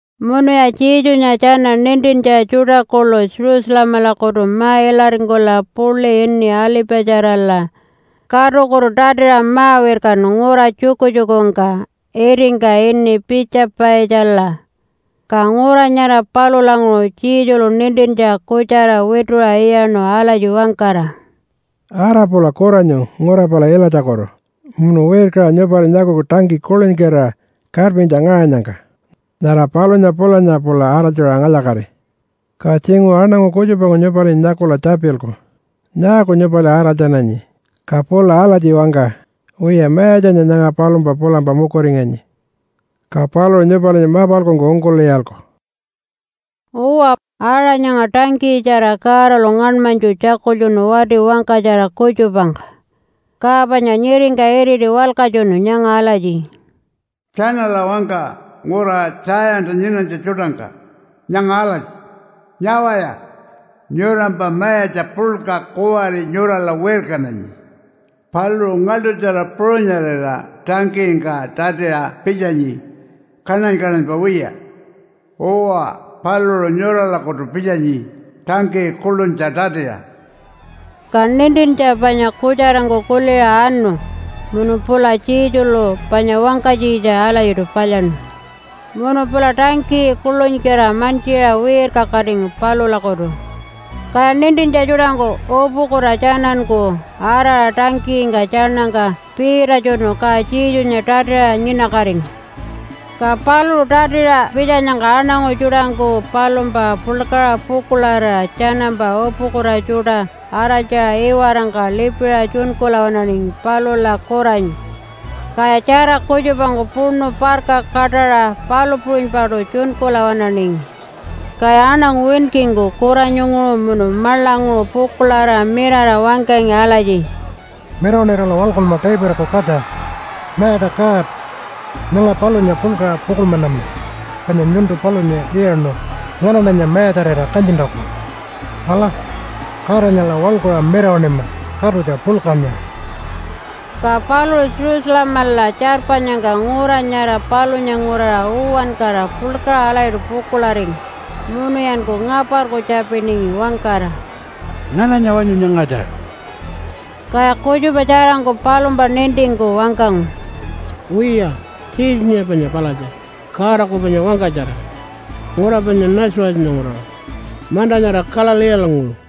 Munuya Jesunya tjana nintintja tjuṯa kuḻu Jerusalemalakutu ma-ilaringkula puḻi ini Alipatjarala katukutu tatiṟa ma-wirkanu ngura tjukutjukungka itingka ini Piitja-paitjala. Ka ngura nyara palulanguṟu Jesulu nintintja kutjara wituṟa iyaṉu alatji wangkara, “Ara pula kuranyu ngura pala ilatjakutu munu wirkaṟa nyupali nyakuku tangkiyi kuḻunykira karpintja ngaṟanyangka. Nyara palunya pulanya pula araltjaṟa ngalya-kati. Ka tjinguṟu aṉangu kutjupangku nyupalinya nyakula tjapilku, ‘Nyaaku nyupali araltjananyi?’ Ka pula alatji wangka, ‘Wiya, Mayatjanya nyanga palumpa pulampa mukuringanyi.’ Ka paluṟu nyupalinya mapalkungku ungkul'iyalku.” Uwa, aṟa nyanga tangkiyitjara Godalu ngaṉmanytju tjakultjunu wati wangkatjara kutjupangka, ka panya nyiringka iriti walkatjunu nyanga alatji, “Tjanala wangka ngura Tjayanta nyinanytja tjuṯangka nyanga alatji, ‘Nyawaya! Nyurampa mayatja puḻka kuwari nyurala wirkananyi. Paluṟu ngaḻṯutjara puṟunyarira tangkiyingka tatiṟa pitjanyi kaṉany-kaṉanypa wiya. Uwa, paluṟu nyuralakutu pitjanyi tangkiyi kuḻunytja tatiṟa.’” Ka nintintja panya kutjarangku kuliṟa anu munu pula Jesulu panya wangkanytjitja alatjiṯu palyaṉu. Munu pula tangkiyi kuḻunykira mantjiṟa wirkakatingu palulakutu. Kaya nintintja tjuṯangku upukuta tjananku araṟa tangkiyingka tjaṉangka piitatjunu ka Jesunya tatiṟa nyinakatingu. Ka paluṟu tatiṟa pitjanyangka aṉangu tjuṯangku palumpa puḻkaṟa pukuḻarira tjanampa upukuta tjuṯa araltjara iwarangka lipiṟa tjunkula waṉaningi palula kuranyu. Kaya tjara kutjupangku puṉu parka kaṯaṟa palu puṟunypaṯu tjunkula waṉaningi. Kaya aṉangu winkingku kuranyunguṟu munu maḻanguṟu pukuḻarira mirara wangkangi alatji, “Mirawaṉirala waḻkunma Davidaku katja! Mayatja God, nyanga palunya puḻkaṟa pukuḻmanama, panya nyuntu palunya iyaṉu nganaṉanya mayatjarira kanyintjaku. Ala, Godanyala waḻkuṟa mirawaṉima katutja puḻkanya!” Ka paluṟu Jerusalemala tjarpanyangka ngura nyara palunya nguraṟa uwankara puḻkaṟa alatjiṯu pukuḻaringu, munuyanku ngaparku tjapiningi wangkara, “Ngananya wanyu nyangatja?” Kaya kutjupa tjarangku palumpa nintingku wangkangu, “Wiya, Jesunya panya palatja, Godaku panya wangkatjara, ngura panya Nazarethanya nguraṟa manta nyara Galileelanguṟu.”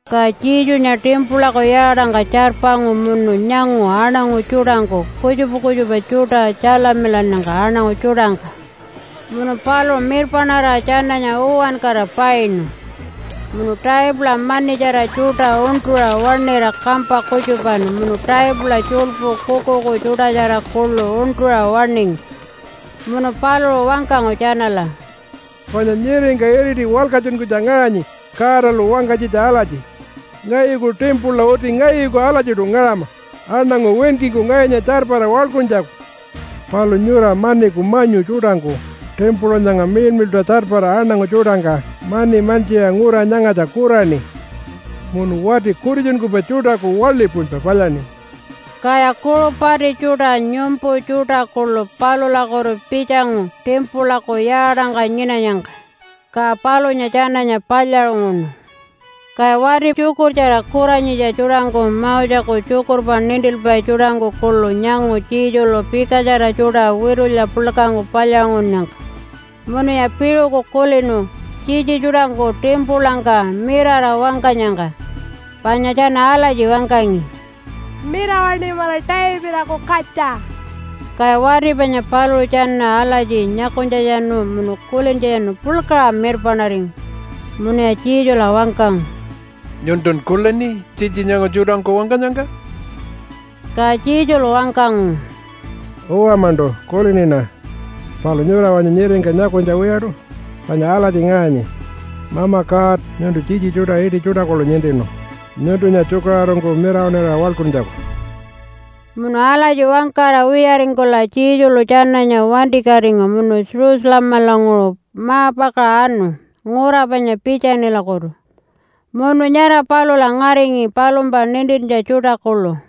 Ka Jesunya timpulaku yaatangka tjarpangu munu nyangu aṉangu tjuṯangku kutjupa kutjupa tjuṯa tjalamilannyangka aṉangu tjuṯangka. Munu paluṟu mirpaṉarira tjananya uwankara painu, munu taipula manitjara tjuṯa uṉṯuṟa waṉira kampa kutjupanu munu taipula tjuḻpu kuukuuku tjuṯatjara kuḻu uṉṯuṟa waṉingu. Munu paluṟu wangkangu tjanala, “Panya nyiringka iriti walkatjunkunytja ngaṟanyi Godalu wangkanytjitja alatji, ‘Ngayuku timpula uti ngayuku alatjiṯu ngaṟama aṉangu winkingku ngayunya tjarpara waḻkuntjaku.’ Palu nyura maniku manyu tjuṯangku timpula nyanga miḻmiḻṯa tjarpara aṉangu tjuṯangka mani mantjiṟa ngura nyangatja kuraṉi munu wati kutitjunkupai tjuṯaku waḻi puṟunypa palyaṉi.” Kaya kuṟu pati tjuṯa nyumpu tjuṯa kuḻu palulakutu pitjangu timpulaku yaatangka nyinanyangka, ka palunya tjananya palyaṟunguṉu. Kaya wati tjukurtjara kuranyitja tjuṯangku Moseku tjukurpa nintilpai tjuṯangku kuḻu nyangu Jesulu pikatjara tjuṯa witulya puḻkangku palyaṟungunnyangka, munuya piṟuku kulinu tjitji tjuṯangku timpulangka mirara wangkanyangka, panya tjana alatji wangkangi, “Mirawaṉimala Davidaku katja!” Kaya wati panya paluṟu tjana alatji nyakunytjatjanu munu kulintjatjanu puḻkaṟa mirpaṉaringu. Munuya Jesula wangkangu, “Nyuntun kulini tjitji nyanga tjuṯangku wangkanyangka?” Ka Jesulu wangkangu, “Uwa-maṉṯu, kuliniṉa. Palu nyura wanyu nyiringka nyakunytja wiyaṯu? Panya alatji ngaṟanyi, ‘Mama God, nyuntu tjitji tjuṯa iṯi tjuṯa kuḻu nintinu nyuntunya tjukaṟurungku mirawaṉira waḻkuntjaku.’” Munu alatji wangkara wiyaringkula Jesulu tjananya wantikatingu munu Jerusalemalanguṟu ma-pakaṟa anu ngura panya Piitjanilakutu munu nyara palula ngaringi palumpa nintintja tjuṯa kuḻu.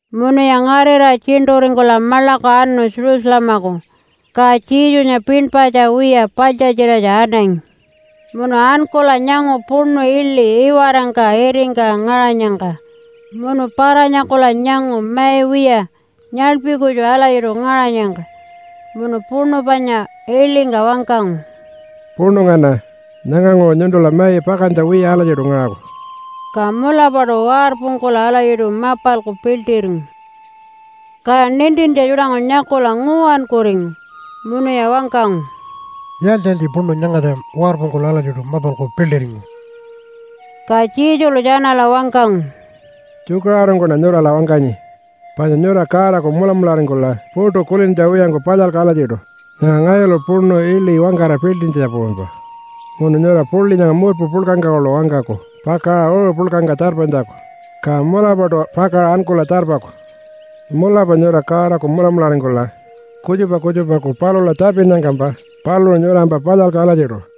Munuya ngarira tjiṉṯuringkula maḻaku anu Jerusalemaku, ka Jesunya pinpatja wiya paḻtjatjiratja anangi. Munu ankula nyangu puṉu iḻi iwarangka itingka ngaṟanyangka munu para-nyakula nyangu mai wiya nyaḻpi kutju alatjiṯu ngaṟanyangka munu puṉu panya iḻingka wangkangu, “Puṉu ngana! Nyanganguṟu nyuntula mai pakantja wiya alatjiṯu ngaṟaku.” Ka mulapaṯu warpungkula alatjiṯu mapalku piḻṯiringu. Kaya nintintja tjuṯangku nyakula nguwankuringu, munuya wangkangu, “Yaaltji-yaaltji puṉu nyangatja warpungkula alatjiṯu mapalku piḻṯiringu?” Ka Jesulu tjanala wangkangu, “Tjukaṟurungkuṉa nyurala wangkanyi, panya nyura Godaku mulamularingkula puṯu kulintja wiyangku palyalku alatjiṯu nyanga ngayulu puṉu iḻi wangkara piḻṯintjanya puṟunypa munu nyura puḻi nyanga murpu puḻkangka kuḻu wangkaku pakaṟa uṟu puḻkangka tjarpanytjaku, ka mulapaṯu pakaṟa ankula tjarpaku. Mulapa nyura Godaku mulamularingkula kutjupa kutjupaku palula tjapinnyangkampa paluṟu nyurampa palyalku alatjiṯu.”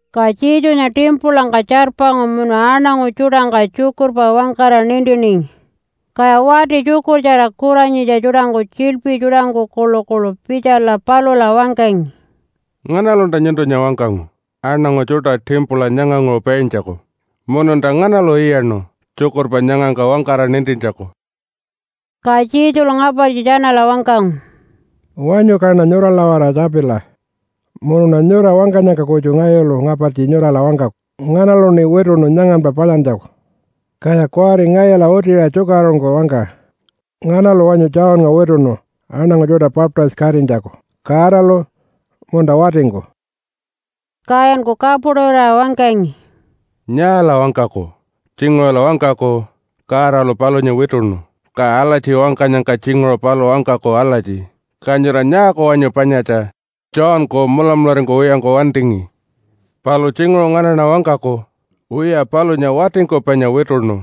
Ka Jesunya timpulangka tjarpangu munu aṉangu tjuṯangka tjukurpa wangkara nintiningi. Kaya wati tjukurtjara kuranyitja tjuṯangku tjiḻpi tjuṯangku kuḻukuḻu pitjala palula wangkangi, “Nganalunta nyuntunya wangkangu aṉangu tjuṯa timpula nyanganguṟu paintjaku? Mununta nganalu iyaṉu tjukurpa nyangangka wangkara nintintjaku?” Ka Jesulu ngapartji tjanala wangkangu, “Wanyu kaṉa nyurala-waraṟa tjapila, munuṉa nyura wangkanyangka kutju ngayulu ngapartji nyurala wangkaku nganaluṉi wituṉu nyanganpa palyantjaku. Kaya kuwari ngayula utiṟa tjukaṟurungku wangka, nganalu wanyu Johnnga wituṉu aṉangu tjuṯa baptise-katinytjaku Godalu munta watingku?” Kayanku kapuṯurira wangkangi, “Nyaala wangkaku? Tjinguṟula wangkaku, ‘Godalu palunya wituṉu.’ Ka alatji wangkanyangka tjinguṟu paluṟu wangkaku alatji, ‘Ka nyura nyaaku wanyu panyatja Johnku mulamularingkuwiyangku wantingi?’ Palu tjinguṟu nganaṉa wangkaku, ‘Wiya palunya watingku panya wituṉu.’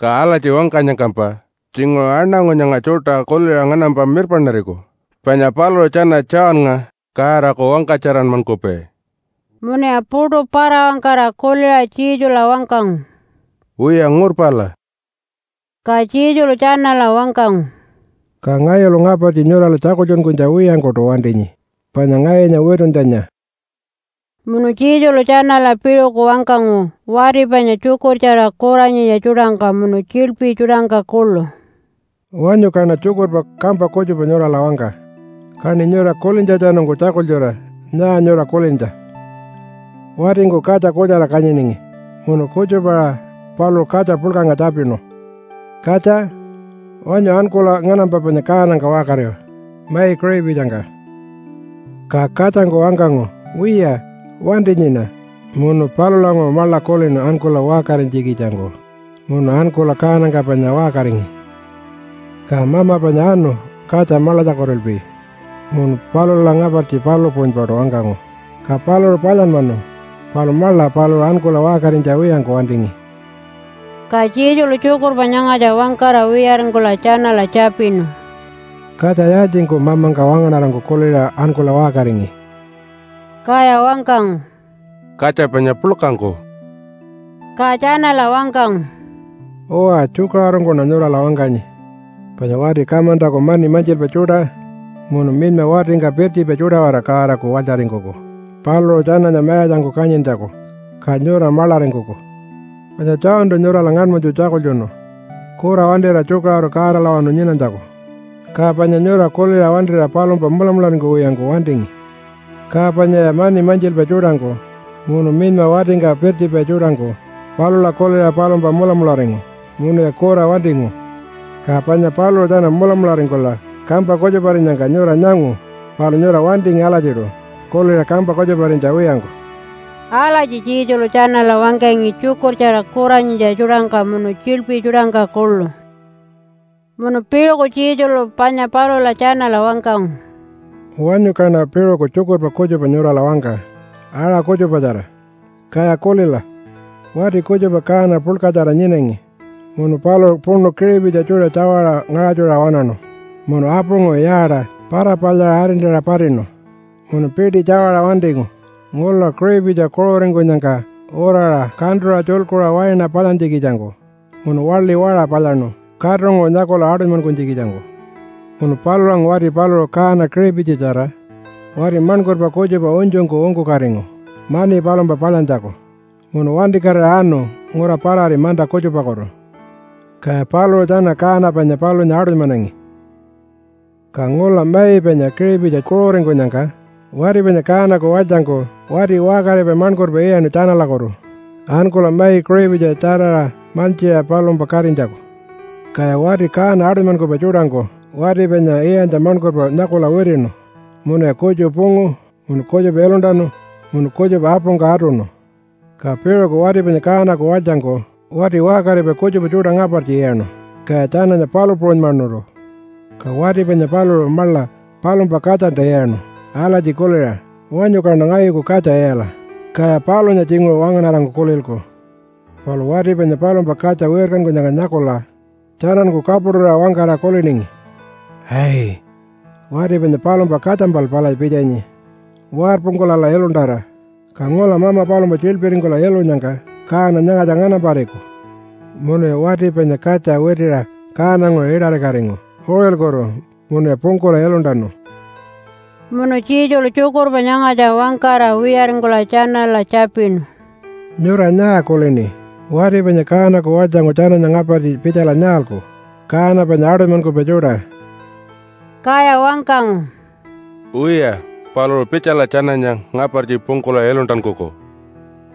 Ka alatji wangkanyangkampa tjinguṟu aṉangu nyanga tjuṯa kuliṟa nganampa mirpaṉariku panya paluṟu tjana Johnnga Godaku wangkatjaranmankupai.” Munuya puṯu para-wangkara kuliṟa Jesula wangkangu, “Wiya ngurpala.” Ka Jesulu tjanala wangkangu, “Ka ngayulu ngapartji nyurala tjakultjunkunytja wiyangkuṯu wantinyi panya ngayunya wituntjanya.” Munu Jesulu tjanala piṟuku wangkangu wati panya tjukurtjara kuranyitja tjuṯangka munu tjiḻpi tjuṯangka kuḻu, “Wanyu kaṉa tjukurpa kampa kutjupa nyurala wangka, kaṉi nyura kulintjatjanungku tjakultjura nyaa nyura kulintja. Watingku katja kutjara kanyiningi. Munu kutjupa-aṟa paluṟu katja puḻkangka tjapinu, ‘Katja, wanyu ankula nganampa panya kaanangka waṟkari mai kiṟipitjingka.’ “Ka katjangku wangkangu, ‘Wiya, wantinyiṉa.’ Munu palulanguṟu maḻa kulinu ankula waṟkarinytjikitjangku, munu ankula kaanangka panya waṟkaringi. “Ka mama panya anu katja maḻatjakutulpi munu palula ngapartji palu puṟunypaṯu wangkangu. Ka paluṟu palyanmanu, palu maḻa paluṟu ankula waṟkarinytja wiyangku wantingi.” Ka Jesulu tjukurpa nyangatja wangkara wiyaringkula tjanala tjapinu, “Katja yaaltjingku mamangka wangaṉarangku kuliṟa ankula waṟkaringi?” Kaya wangkangu, “Katja panya puḻkangku.” Ka tjanala wangkangu, “Uwa, tjukaṟurungkuṉa nyurala wangkanyi, panya wati kamantaku mani mantjilpai tjuṯa munu minyma watingka pirtjipai tjuṯa-waraṟa Godaku walytjaringkuku paluṟu tjananya mayatjangku kanyintjaku, ka nyura maḻaringkuku. Panya Johntu nyurala ngaṉmanytju tjakultjunu kura wantira tjukaṟuru Godalawanu nyinanytjaku, ka panya nyura kuliṟa wantira palumpa mulamularingkuwiyangku wantingi. Ka panyaya mani mantjilpai tjuṯangku munu minyma watingka pirtjipai tjuṯangku palula kuliṟa palumpa mulamularingu munuya kura wantingu. Ka panya paluṟu tjana mulamularingkula kampa kutjuparinyangka nyura nyangu, palu nyura wantingi alatjiṯu kuliṟa kampa kutjuparinytja wiyangku.” Alatji Jesulu tjanala wangkangi tjukurtjara kuranyitja tjuṯangka munu tjiḻpi tjuṯangka kuḻu. Munu piṟuku Jesulu panya palula tjanala wangkangu, “Wanyu kaṉa piṟuku tjukurpa kutjupa nyurala wangka aṟa kutjupatjara, kaya kulila! Wati kutjupa kaana puḻkatjara nyinangi munu paluṟu puṉu kiṟipitji tjuṯa tjawaṟa ngaṟatjuṟa waṉaṉu munu apunguṟu yaata para-palyaṟa arintaṟa patinu munu piṯi tjawaṟa wantingu ngula kiṟipitji kuṟuringkunyangka uraṟa kantuṟa tjulkuṟa waina palyantjikitjangku munu waḻi waṟa palyaṉu katunguṟu nyakula aṯunymankunytjikitjangku. Munu palulanguṟu wati paluṟu kaana kiṟipitjitjara wati maṉkurpa kutjupa unytjungku ungkukatingu mani palumpa palyantjaku, munu wantikatira anu ngura parari manta kutjupakutu. Kaya paluṟu tjana kaana panya palunya aṯunymanangi. “Ka ngula mai panya kiṟipitji kuṟuringkunyangka wati panya kaanaku walytjangku wati waṟkaripai maṉkurpa iyaṉu tjanalakutu ankula mai kiṟipitji tjaraṟa mantjiṟa palumpa katinytjaku. Kaya wati kaana aṯunymankupai tjuṯangku wati panya iyantja maṉkurpa nyakula witiṉu munuya kutju pungu munu kutjupa iluntanu munu kutjupa apungka atuṉu. Ka piṟuku wati panya kaanaku walytjangku wati waṟkaripai kutjupa tjuṯa ngapartji iyaṉu, kaya tjananya palu puṟunymanuṯu. Ka wati panya paluṟu maḻa palumpa katjalta iyaṉu alatji kuliṟa, ‘Wanyu kaṉa ngayuku katja iyala, kaya palunya tjinguṟu wangaṉarangku kulilku.’ Palu wati panya palumpa katja wirkankunyangka nyakula tjananku kapuṯurira wangkara kuliningi, ‘Ai, wati panya palumpa katjampal palatja pitjanyi! Warpungkulala iluntara, ka ngula mama palumpa tjiḻpiringkula ilunyangka kaana nyangatja nganampariku.’ Munuya wati panya katja witiṟa kaananguṟu iṯarikatingu uṟilkutu munuya pungkula iluntanu.” Munu Jesulu tjukurpa nyangatja wangkara wiyaringkula tjanala tjapinu, “Nyura nyaa kulini? Wati panya kaanaku walytjangku tjananya ngapartji pitjala nyaalku kaana panya aṯunymankupai tjuṯa?” Kaya wangkangu, “Wiya, paluṟu pitjala tjananya ngapartji pungkula iluntankuku,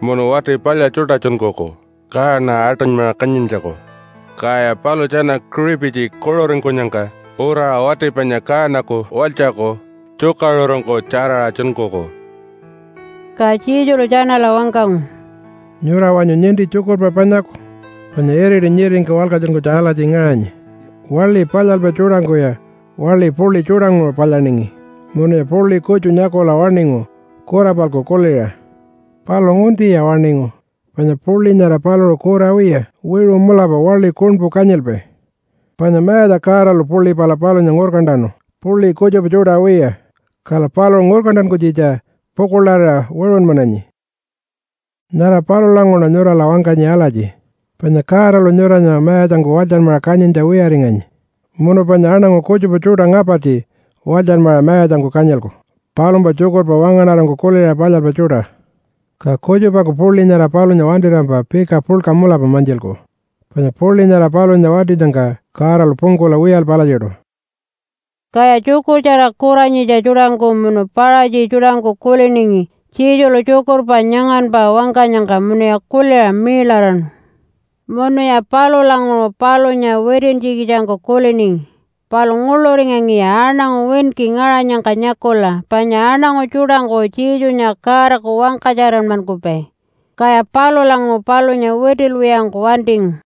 munu wati palya tjuṯa tjunkuku kaana aṯunymaṟa kanyintjaku, kaya paluṟu tjana kiṟipitji kuṟuringkunyangka uraṟa wati panya kaanaku walytjaku tjukaṟurungku tjaraṟa tjunkuku.” Ka Jesulu tjanala wangkangu, “Nyura wanyu ninti tjukurpa panyaku? Panya iriti nyiringka walkatjunkunytja alatji ngaṟanyi, ‘Waḻi palyalpai tjuṯangkuya waḻi puḻi tjuṯanguṟu palyaningi, munuya puḻi kutju nyakula waṉingu kura-palku kuliṟa. Palu nguntiya waṉingu, panya puḻi nyara paluṟu kura wiya, wiṟu mulapa waḻi kuṉpu kanyilpai. Panya Mayatja Godalu puḻi pala palunya ngurkantanu puḻi kutjupa tjuṯa wiya, kala paluṟu ngurkantankunytjitja pukuḻarira wiṟunmananyi.’ Nyara palulanguṟuṉa nyurala wangkanyi alatji, panya Godalu nyuranya mayatjangku walytjanmaṟa kanyintja wiyaringanyi munu panya aṉangu kutjupa tjuṯa ngapartji walytjanmaṟa mayatjangku kanyilku palumpa tjukurpa wangaṉarangku kuliṟa palyalpai tjuṯa. Ka kutjupangku puḻi nyara palunya wantirampa pika puḻka mulapa mantjilku. Panya puḻi nyara palunya wantinyangka Godalu pungkula wiyalpai alatjiṯu.” Kaya tjukurtjara kuranyitja tjuṯangku munu Paṟatji tjuṯangku kuliningi Jesulu tjukurpa nyanganpa wangkanyangka munuya kuliṟa miiḻaraṉu. Munuya palulanguṟu palunya witintjikitjangku kuliningi, palu nguḻuringangiya aṉangu winki ngaṟanyangka nyakula panya aṉangu tjuṯangku Jesunya Godaku wangkatjaranmankupai, kaya palulanguṟu palunya witilwiyangku wantingu.